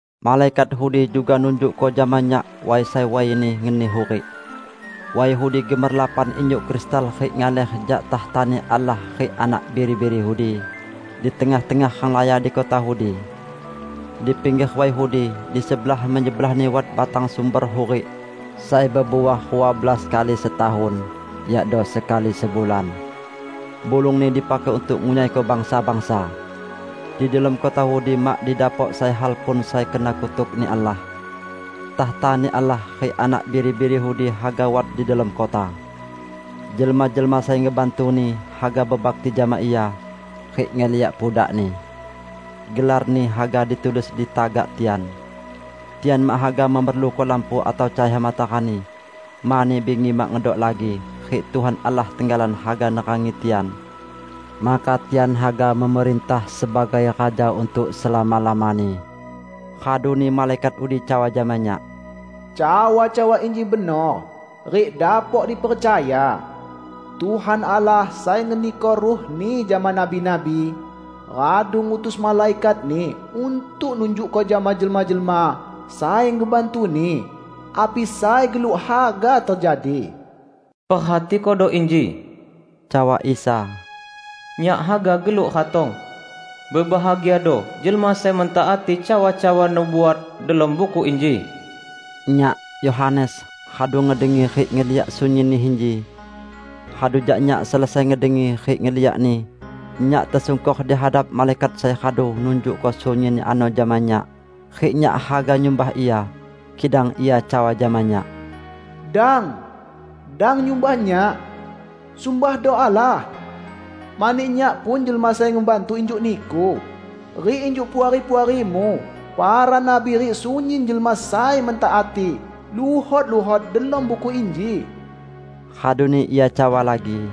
Malaikat udi juga nunjukko jama nyak way sai wayni ngeni hurik. Way udi gemerlapan injuk kristal rik ngaler jak takhtani Allah rik Anak Biri-biri udi, di tengah-tengah renglaya di kota udi. Di pingger way udi, di sebelah-menyebelahni wat batang sumber hurik, sai bebuah rua belas kali setahun, yakdo sekali sebulan. Bulungni dipakai untuk ngunyaiko bangsa-bangsa. Di delom kota udi mak didapok sai hal pun sai kena kutuk-Ni Allah. Takhtani Allah rik Anak Biri-biri udi haga wat di delom kota. Jelma-jelma sai ngebantu-Ni haga bebakti jama Ia, rik ngeliak pudak-Ni. Gelar-Ni haga ditulis di tagak tian. Tian mak haga memerluko lampu atau cahaya matarani, mani bingi mak ngedok lagi, rik Tuhan Allah tenggalan haga nerangi tian. Maka tian haga memerintah sebagai raja untuk selama-lamani. Raduni malaikat udi cawa jama nyak, "Cawa-cawa inji benor rik dapok dipercaya. Tuhan Allah sai ngeniko Ruh-Ni jama nabi-nabi, radu ngutus malaikat-Ni untuk nunjukko jama jelma-jelma sai ngebantu-Ni api sai geluk haga tejadi." "Perhatikodo inji!" Cawa Isa, "Nyak haga geluk ratong. Bebahagiado jelma sai mentaati cawa-cawa nubuat delom buku inji." Nyak, Yohanes, radu ngedengi rik ngeliak sunyinni inji. Radu jak nyak selesai ngedengi rik ngeliakni nyak tesungkor di hadap malaikat sai radu nunjukko sunyinni ano jama nyak, rik nyak haga nyumbah ia, kidang ia cawa jama nyak, "Dang! Dang nyumbah nyak! Sumbahdo Allah! Mani nyak pun jelma sai ngebantu injuk niku, rik injuk puari-puarimu para nabi rik sunyin jelma sai mentaati luhot-luhot delom buku inji!" Raduni ia cawa lagi,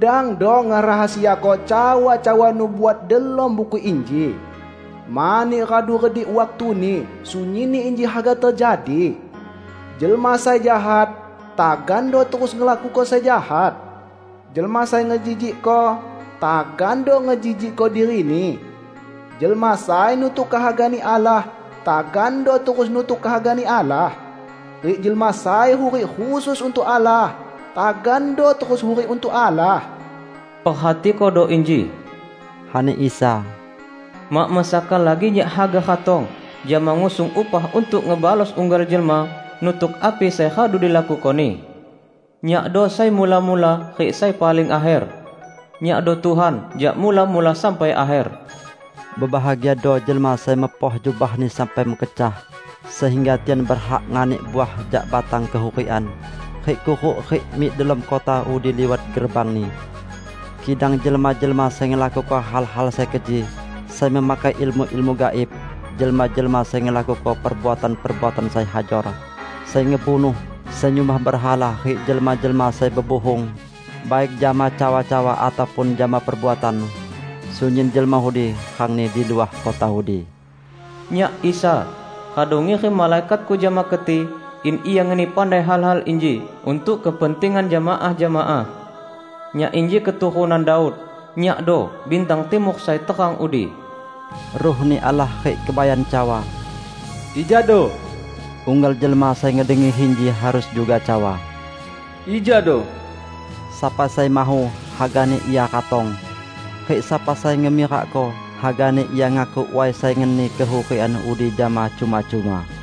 "Dangdo ngerahasiako cawa-cawa nubuat delom buku inji, mani radu redik waktuni sunyinni inji haga tejadi. Jelma sai jahat, tagando terus ngelakuko sai jahat, jelma sai ngejijikko, tagando ngejijikko dirini; jelma sai nutuk kehaga-Ni Allah, tagando terus nutuk kehaga-Ni Allah, rik jelma sai hurik khusus untuk Allah, tagando terus hurik untuk Allah." "Perhatikodo inji!" ani Isa, "Mak mesaka lagi Nyak haga ratong jama ngusung upah untuk ngebalos unggal jelma nutuk api sai radu dilakukoni. Nyakdo sai mula-mula rik sai paling akher; Nyakdo Tuhan jak Mula-mula sampai Akher." Bebahagiado jelma sai mepoh jubahni sampai mekecah sehingga tian berhak nganik uah jak batang kehurikan rik kuruk rik mik delom kota udi liwat gerbangni. Kidang jelma-jelma sai ngelakuko hal-hal sai keji, sai memakai ilmu-ilmu gaib, jelma-jelma sai ngelakuko perbuatan-perbuatan sai hajor, sai ngebunuh, sai nyumbah berhala rik jelma-jelma sai bebuhung, baik jama cawa-cawa ataupun jama perbuatan, sunyin jelma udi rangni di luah kota udi. "Nyak, Isa, radu ngirim malaikat-Ku jama keti in ia ngeni pandai hal-hal inji untuk kepentingan jemaah-jemaah. Nyak inji keturunan Daud; Nyakdo bintang timur sai terang udi." Ruh-Ni Allah rik Kebayan cawa, "Ijado!" Unggal jelma sai ngedengi inji harus juga cawa, "Ijado!" Sapa sai mahu, hagani ia ratong! Rik sapa sai ngemirakko, hagani ia ngakuk way sai ngeni kehurikan udi jama cuma-cuma.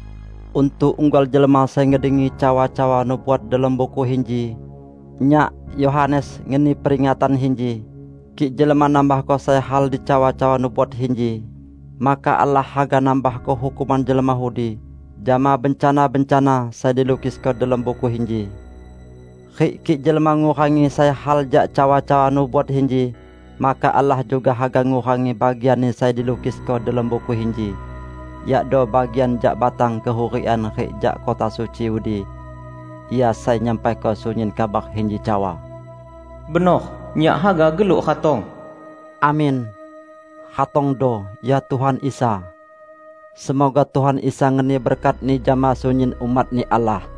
Untuk unggal jelma sai ngedengi cawa-cawa nubuat delom buku inji, nyak, Yohanes, ngeni peringatan inji: kik jelma nambahko sai hal di cawa-cawa nubuat inji, maka Allah haga nambahko hukuman jelma udi jama bencana-bencana sai dilukisko delom buku inji. Rik kik jelma ngurangi sai hal jak cawa-cawa nubuat inji, maka Allah juga haga ngurangi bagianni sai dilukisko delom buku inji -- yakdo bagian jak batang kehurikan rik jak kota suci udi. Ia sai nyampaiko sunyin kabar inji cawa, "Benor, Nyak haga geluk ratong!" Amin! Ratongdo, ya Tuhan Isa! Semoga Tuhan Isa ngeni berkat-Ni jama sunyin umat-Ni Allah!